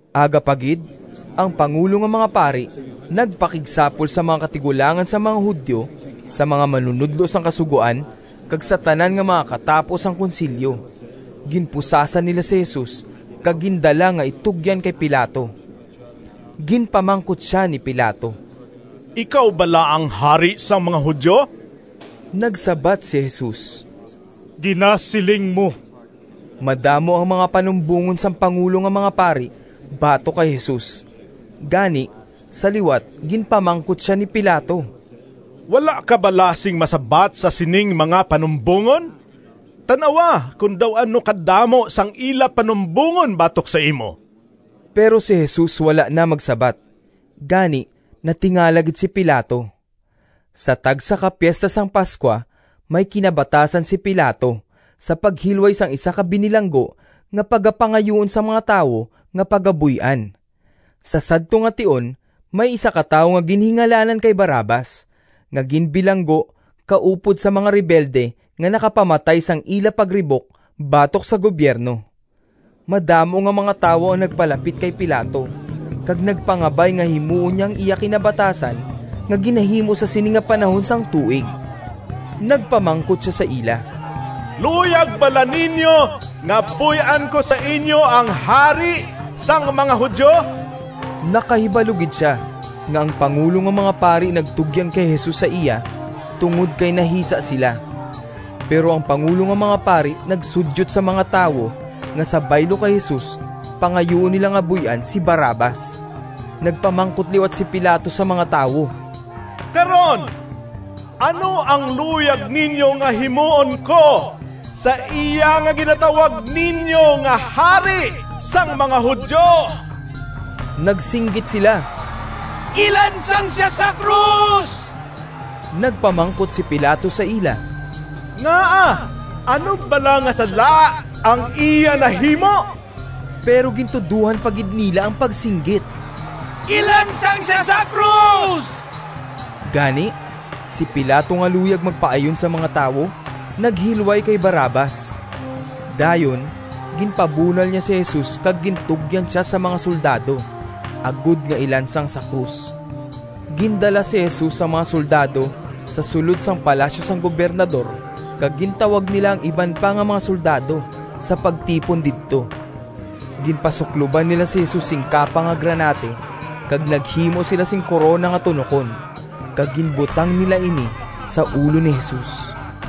Aga pa gid ang pangulo nga mga pari nagpakigsapol sa mga katigulangan sang mga Judio, sa mga manunodlo sang Kasugoan, kag sa tanan nga mga katapo sang Konsilyo. Ginpusasan nila si Jesus kag gindala nga itugyan kay Pilato. Ginpamangkot sia ni Pilato, “Ikaw bala ang hari sang mga Judio?” Nagsabat si Jesus, “Ginasiling mo!” Madamo ang mga panumbongon sang pangulo nga mga pari batok kay Jesus, gani sa liwat ginpamangkot sia ni Pilato, “Wala ka bala sing masabat sa sining mga panumbongon? Tan-awa kon daw ano kadamo sang ila panumbongon batok sa imo!” Pero si Jesus wala na magsabat, gani natingala gid si Pilato. Sa tagsa ka Piesta sang Pascua may kinabatasan si Pilato sa paghilway sang isa ka binilanggo nga pagapangayuon sang mga tawo nga pagabuy-an. Sa sadto nga tion may isa ka tawo nga ginhingalanan kay Barrabas nga ginbilanggo kaupod sa mga rebelde nga nakapamatay sang ila pagribok batok sa gubyerno. Madamo nga mga tawo ang nagpalapit kay Pilato kag nagpangabay nga himuon niya ang iya kinabatasan nga ginahimo sa sini nga panahon sang tuig. Nagpamangkot sia sa ila, “Luyag bala ninyo nga buy-an ko sa inyo ang Hari sang mga Judio?” Nakahibalo gid sia nga ang pangulo nga mga pari nagtugyan kay Jesus sa iya tungod kay nahisa sila. Pero ang pangulo nga mga pari nagsudyot sa mga tawo nga sa baylo kay Jesus pangayuon nila nga buy-an si Barrabas. Nagpamangkot liwat si Pilato sa mga tawo, “Karon ano ang luyag ninyo nga himuon ko sa iya nga ginatawag ninyo nga Hari sang mga Judio?” Nagsinggit sila, “Ilansang sia sa krus!” Nagpamangkot si Pilato sa ila, “Ngaa ano bala nga sala ang iya nahimo?” Pero gintudohan pa gid nila ang pagsinggit, “Ilansang sia sa krus!” Gani, si Pilato nga luyag magpaayon sa mga tawo naghilway kay Barrabas. Dayon ginpabunal niya si Jesus kag gintugyan sia sa mga soldado, agod nga ilansang sa krus. Gindala si Jesus sang mga soldado sa sulod sang palasyo sang Gobernador kag gintawag nila ang iban pa nga mga soldado sa pagtipon didto. Ginpasukloban nila si Jesus sing kapa nga granate kag naghimo sila sing korona nga tunokon kag ginbutang nila ini sa ulo ni Jesus.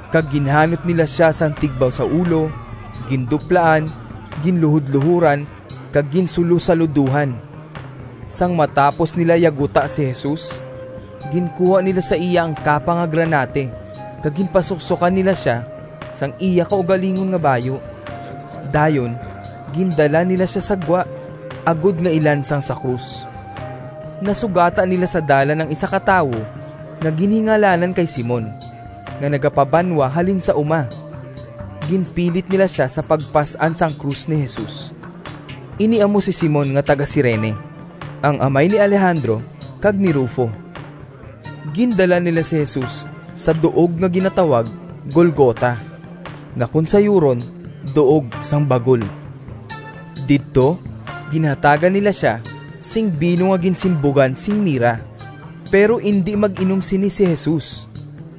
Kag ginhanot nila sia sang tigbaw sa ulo, ginduplaan, ginluhodluhoran kag ginsulosaludohan. Sang matapos nila yaguta si Jesus, ginkuha nila sa iya ang kapa nga granate kag ginpasuksokan nila sia sang iya kaugalingon nga bayu. Dayon gindala nila sia sa gwa agod nga ilansang sa krus. Nasugata nila sa dalan ang isa ka tawo nga ginhingalanan kay Simon nga nagapabanwa halin sa uma. Ginpilit nila sia sa pagpas-an sang krus ni Jesus. (Ini amo si Simon nga taga-Cirene, ang amay ni Alejandro kag ni Rufo.) Gindala nila si Jesus sa duog nga ginatawag Golgota, nga kon sayuron “Duog sang Bagol.” Didto ginhatagan nila sia sing bino nga ginsimbugan sing mira, pero indi mag-inom sini si Jesus.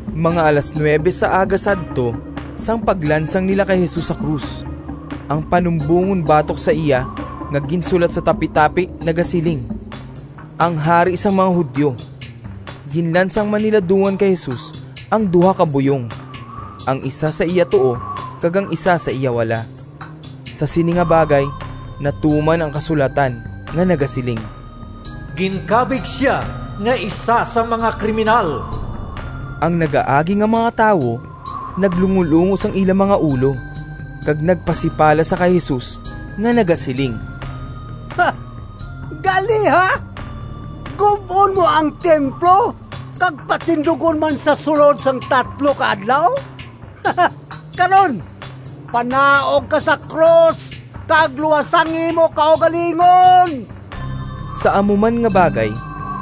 Mga alas nuwebe sa aga sadto sang paglansang nila kay Jesus sa krus. Ang panumbongon batok sa iya nga ginsulat sa tapitapi nagasiling, “Ang Hari sang mga Judio.” Ginlansang man nila dungan kay Jesus ang duha ka buyong, ang isa sa iya tuo kag ang isa sa iya wala. [ Sa sini nga bagay natuman ang kasulatan nga nagasiling, “Ginkabig sia nga isa sang mga kriminal.”] Ang nagaagi nga mga tawo naglungolungo sang ila mga ulo kag nagpasipala sa kay Jesus nga nagasiling, “Gali ha! Gub-on mo ang templo kag patindugon man sa sulod sang tatlo ka adlaw? Karon panaog ka sa krus kag luwasa ang imo kaugalingon!” Sa amo man nga bagay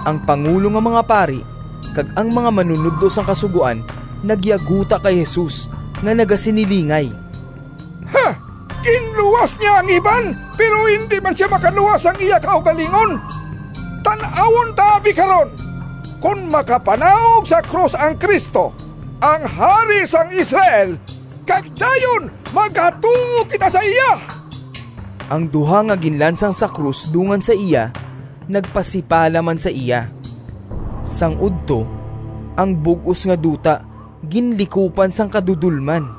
ang pangulo nga mga pari kag ang mga manunodlo sang Kasugoan nagyaguta kay Jesus nga nagasinilingay, “Ginluwas niya ang iban, pero indi man sia makaluwas sang iya kaugalingon. Tan-awon ta abi karon kon makapanaog sa krus ang Cristo, ang Hari sang Israel, kag dayon magatuo kita sa iya.” Ang duha nga ginlansang sa krus dungan sa iya nagpasipala man sa iya. Sang udto, ang bug-os nga duta ginlikupan sang kadudolman.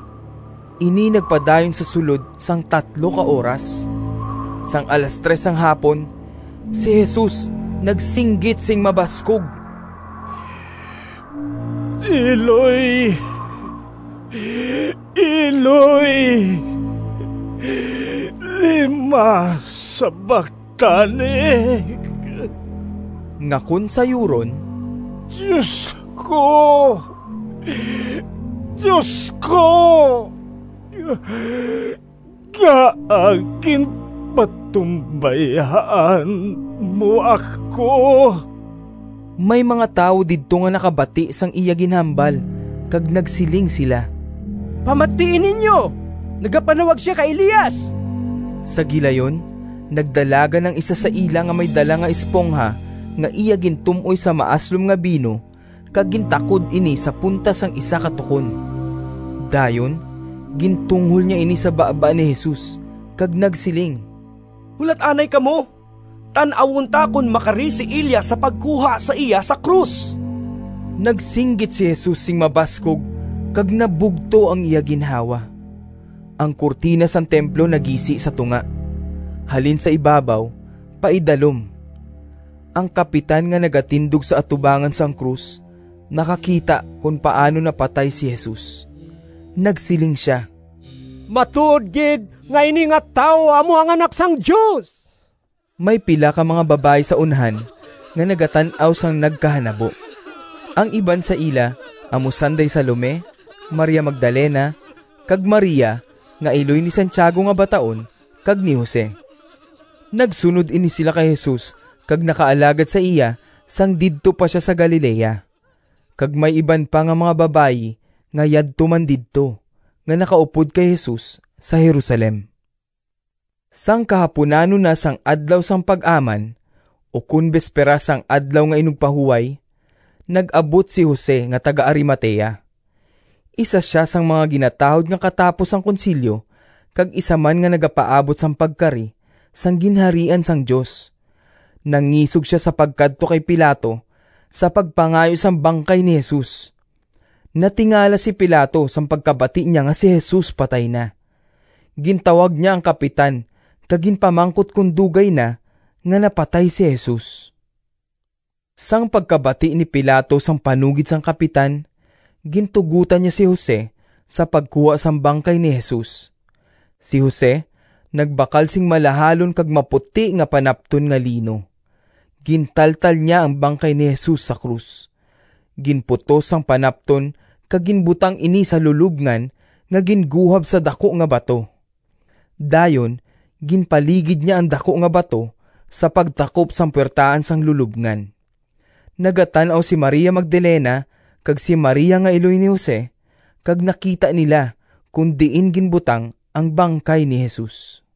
Ini nagpadayon sa sulod sang tatlo ka oras. Sang alas tres sang hapon si Jesus nagsinggit sing mabaskog, “Eloi, Eloi, lema sabactani?” nga kon sayuron, “Dios ko, Dios ko, ngaa ginpatumbayaan mo ako?” May mga tawo didto nga nakabati sang iya ginhambal kag nagsiling sila, “Pamatii ninyo, nagapanawag sia kay Elias!” Sa gilayon nagdalagan ang isa sa ila nga may dala nga espongha nga iya gintum-oy sa maaslom nga bino kag gintakod ini sa punta sang isa ka tukon. Dayon gintunghol niya ini sa baba ni Jesus kag nagsiling, “Hulat anay kamo! Tan-awon ta kon makari si Elias sa pagkuha sa iya sa krus.” Nagsinggit si Jesus sing mabaskog kag nabugto ang iya ginhawa. Ang kurtina sang templo nagisi sa tunga, halin sa ibabaw pa idalom. Ang kapitan nga nagatindog sa atubangan sang krus nakakita kon paano napatay si Jesus. Nagsiling sia, “Matuod gid nga ini nga tawo amo ang Anak sang Dios!” May pila ka mga babayi sa unhan nga nagatan-aw sang nagkahanabo. Ang iban sa ila amo sanday Salome, Maria Magdalena, kag Maria nga iloy ni Santiago nga bataon kag ni Jose. Nagsunod ini sila kay Jesus kag nakaalagad sa iya sang didto pa sia sa Galilea. Kag may iban pa nga mga babayi nga yadto man didto, nga nakaupod kay Jesus sa Jerusalem. Sang kahapunanon na sang Adlaw sang Pag-aman, ukon besperas sang Adlaw nga Inugpahuway, nag-abot si Jose nga taga-Arimatea. Isa sia sang mga ginatahod nga katapo sang Konsilyo kag isa man nga nagapaabot sang pagkari sang Ginharian sang Dios. Nangisog sia sa pagkadto kay Pilato sa pagpangayo sang bangkay ni Jesus. Natingala si Pilato sang pagkabati niya nga si Jesus patay na. Gintawag niya ang kapitan kag ginpamangkot kon dugay na nga napatay si Jesus. Sang pagkabati ni Pilato sang panugid sang kapitan, gintugotan niya si Jose sa pagkuha sang bangkay ni Jesus. Si Jose nagbakal sing malahalon kag maputi nga panapton nga lino, gintaltal niya ang bangkay ni Jesus sa krus, ginputos sang panapton kag ginbutang ini sa lulobngan nga ginguhab sa daku nga bato. Dayon ginpaligid niya ang daku nga bato sa pagtakop sang puwertahan sang lulobngan. Nagatan-aw si Maria Magdalena kag si Maria nga iloy ni Jose kag nakita nila kon diin ginbutang ang bangkay ni Jesus.